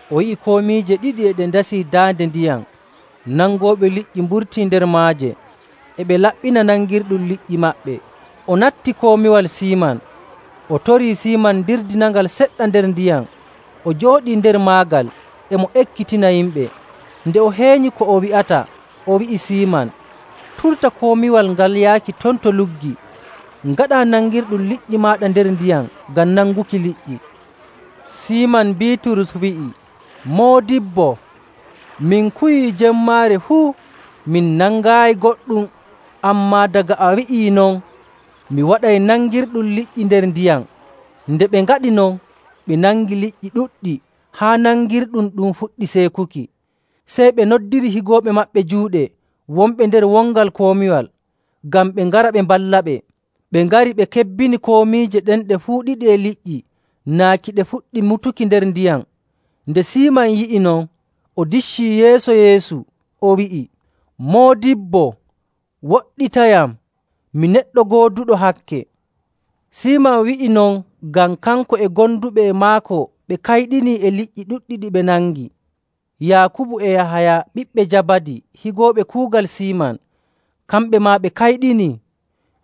O yi'i komiije ɗiɗi e ɗe ndesii daande ndiyam. Nangooɓe liƴƴi mburtii nder maaje, e ɓe laɓɓina nangirɗum liƴƴi maɓɓe. O natti komiwal Siiman, o torii Siiman dirdinangal seɗɗa nder ndiyam. O jooɗii nder maagal, e mo ekkitina yimɓe.. Nde o heenyi ko o wi'ata, o wi'i Siiman, “Turta komiwal ngal yaaki ton to luggi, ngaɗaa nangirɗum liƴƴi maaɗa nder ndiyam ngam nanguki liƴƴi.” Siiman Biiturus wi'i, “Moodibbo, min kuwii jemmaare fuu, min nangaayi goɗɗum. Ammaa daga a wi'i non, mi waɗay nangirɗum liƴƴi nder ndiyam.”. Nde ɓe ngaɗi non, ɓe nangi liƴƴi ɗuɗɗi haa nangirɗum ɗum fuɗɗi seekuki.. Sey ɓe noddiri higooɓe maɓɓe juuɗe, wonɓe nder wongal komiwal, ngam ɓe ngara ɓe mballaɓe. Ɓe ngari, ɓe kebbini komiije ɗen ɗe fuu ɗiɗi e liƴƴi naaki ɗe fuɗɗi mutuki: Waato nusaaki. nder ndiyam. Nde Siiman yi'i non, o diccii yeeso Yeesu, o wi'i, “Moodibbo, woɗɗitayam, mi neɗɗo gooduɗo hakke!” Siiman wi'i non ngam kanko e gonduɓe e maako ɓe kayɗinii e liƴƴi ɗuɗɗi ɗi ɓe nangi. Yaakubu e Yahaya, ɓiɓɓe Jabadi, higooɓe kuugal Siiman, kamɓe maa ɓe kayɗinii.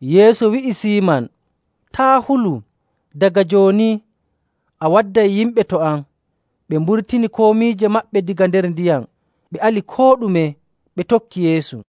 Yeesu wi'i Siiman, “Taa' hulu! Daga jooni a wadday yimɓe to am.” Ɓe mburtini komiije maɓɓe daga nder ndiyam, ɓe ali koo ɗume, ɓe tokki Yeesu.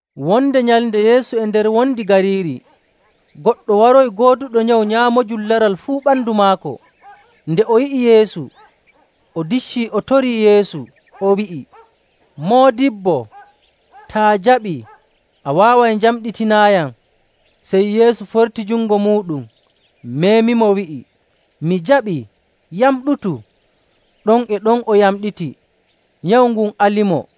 Wonde nyalnde Yeesu e nder wondi gariiri, goɗɗo waroyi gooduɗo nyawu nyaamoojum laral fuu ɓandu maako. Nde o yi'i Yeesu, o diccii, o torii Yeesu, o wi'i, “Moodibbo, taa jaɓii, a waaway njamɗitinaayam.” Sey Yeesu forti jungo muuɗum, meemimo, wi'i, “Mi jaɓii. Yamɗutu!” Ɗon e ɗon o yamɗiti, nyawu ngun alimo.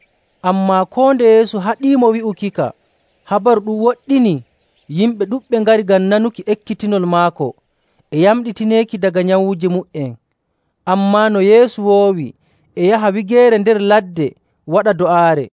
Ammaa koo nde Yeesu haɗiimo wi'ukika, habaru ɗum woɗɗinii, yimɓe ɗuɗɓe ngari ngam nanuki ekkitinol maako e yamɗitineeki daga nyawuuji mu''en. Ammaa no Yeesu woowi e yaha wigeere nder ladde waɗa do'aare.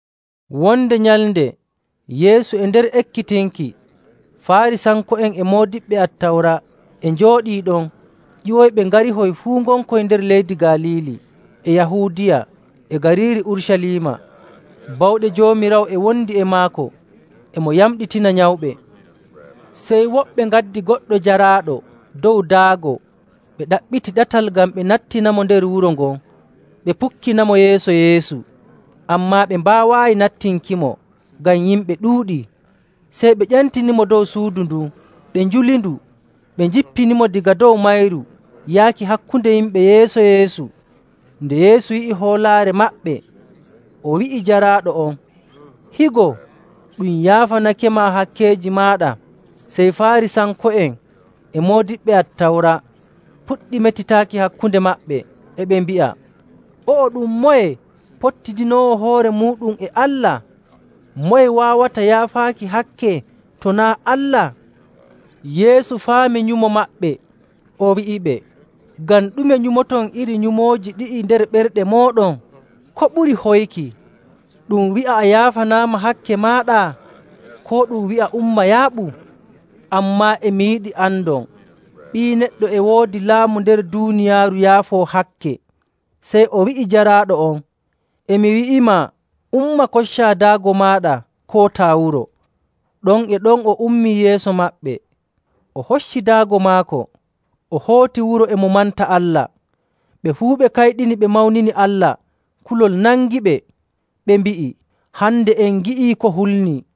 Wonde nyalnde Yeesu e nder ekkitinki, Faarisanko'en e moodiɓɓe Attawra e njooɗii ɗon ƴiwoyɓe ngarihoy fuu ngonkoy nder leyɗe Galiili e Yahuudiya e gariiri Urucaliima. Bawɗe Joomiraawo e wondi e maako, e mo yamɗitina nyawɓe. Sey woɓɓe ngaddi goɗɗo jaraaɗo dow daago, ɓe ɗaɓɓiti ɗatal ngal ɓe nattinirtamo nder wuro ngon, ɓe pukkinamo yeeso Yeesu. Ammaa ɓe mbaawaayi nattinkimo ngam yimɓe ɗuuɗii, sey ɓe ƴentinimo dow suudu ndun, ɓe njulindu, ɓe njippinimo daga dow mayru yaaki hakkunde yimɓe yeeso Yeesu. Nde Yeesu yi'i hoolaare maɓɓe, o wi'i jaraaɗo on, “Higo, ɗum yaafanakema hakkeeji maaɗa.” Sey Faarisanko'en e moodiɓɓe Attawra puɗɗi metitaaki hakkunde maɓɓe, e ɓe mbi'a, “O'o ɗum moye pottidinoowo hoore muuɗum e Allah? Moye waawata yaafaaki hakke to naa' Allah?” Yeesu faami nyumo maɓɓe, o wi'iɓe, “Ngam ɗume nyumoton iri nyumooji ɗi'i nder ɓerɗe mooɗon? Ko ɓuri hoyki, ɗum wi'a, ‘A yaafanaama hakke maaɗa,’ koo ɗum wi'a, ‘Umma yaaɓu?’ Ammaa e mi yiɗi andon Ɓii Neɗɗo e woodi laamu nder duuniyaaru yaafoo hakke.” Sey o wi'i jaraaɗo on, “E mi wi'imaa, umma, koccaa daago maaɗa, kootaa wuro!” Ɗon e ɗon o ummii yeeso maɓɓe, o hocci daago maako, o hooti wuro, e mo manta Allah. Ɓe fuu ɓe kayɗini, ɓe mawnini Allah. Kulol nangiɓe, ɓe mbi'i, “Hande en ngi'i ko hulnii!”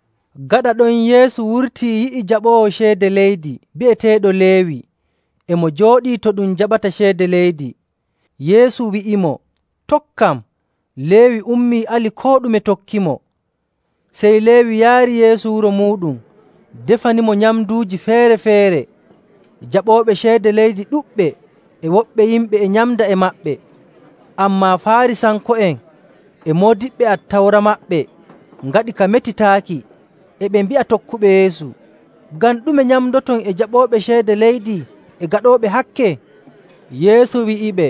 Gaɗa ɗon, Yeesu wurtii yi'i jaɓoowo ceede leydi bi'eteeɗo Leewi, e mo jooɗii to ɗum jaɓata ceede leydi, Yeesu wi'imo, “Tokkam.” Leewi ummii, ali koo ɗume, tokkimo. Sey Leewi yaari Yeesu wuro muuɗum defanimo nyamnduuji feere‑feere. Jaɓooɓe ceede leydi ɗuɗɓe e woɓɓe yimɓe e nyamda e maɓɓe. Ammaa, Faarisanko'en e moodiɓɓe Attawra maɓɓe ngaɗi ka metitaaki, e ɓe mbi'a tokkuɓe Yeesu, “Ngam ɗume nyamdoton e jaɓooɓe ceede leydi e gaɗooɓe hakke?”. Yeesu wi'iɓe,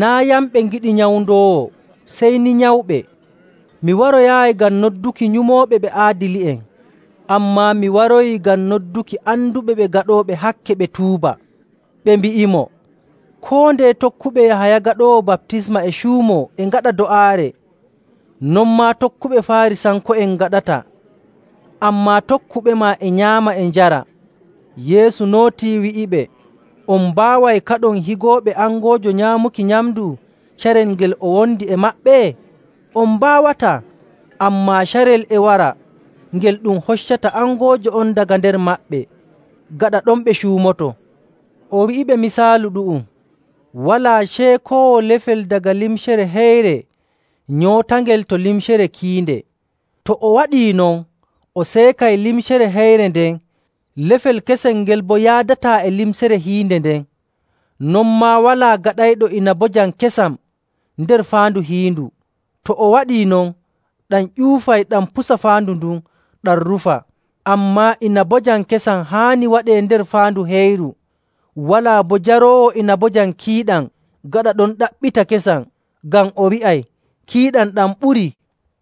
“Naa' yamɓe ngiɗi nyawndoowo, sey ni nyawɓe. Mi waroyaayi ngam nodduki nyumooɓe ɓe aadili'en, ammaa mi waroyi ngam nodduki anduɓe ɓe gaɗooɓe hakke ɓe tuuba.” Ɓe mbi'imo, “Koo ndeye tokkuɓe Yahaya Gaɗoowo Baptisma e cuumoo e ngaɗa do'aare, non maa tokkuɓe Faarisanko'en ngaɗata, ammaa tokkuɓema e nyaama e njara.” Yeesu nootii wi'iɓe, “On mbaaway kaɗon higooɓe angoojo nyaamuki nyamndu carel ngel o wondi e maɓɓe? On mbaawataa! Ammaa carel e wara ngel ɗum hoccata angoojo on daga nder maɓɓe, gaɗa ɗon ɓe cuumoto.” O wi'iɓe misaalu ɗu'um, “Walaa ceekoowo lefel daga limcere heyre nyootangel to limcere kiinde. To o waɗii non, o seekay limcere heyre nden, lefel kesel ngel boo yaadataa e limcere hiinde nden. Non maa walaa gaɗayɗo inabojam kesam nder faandu hiindu. To o waɗii non, ɗam ƴuufay, ɗam pusa faandu ndun, ɗam rufa. Ammaa, inabojam kesam haani waɗee nder faandu heyru. Walaa boo jaroowo inabojam kiiɗam gaɗa ɗon ɗaɓɓita kesam, ngam o wi'ay, ‘Kiiɗam ɗam ɓurii.’”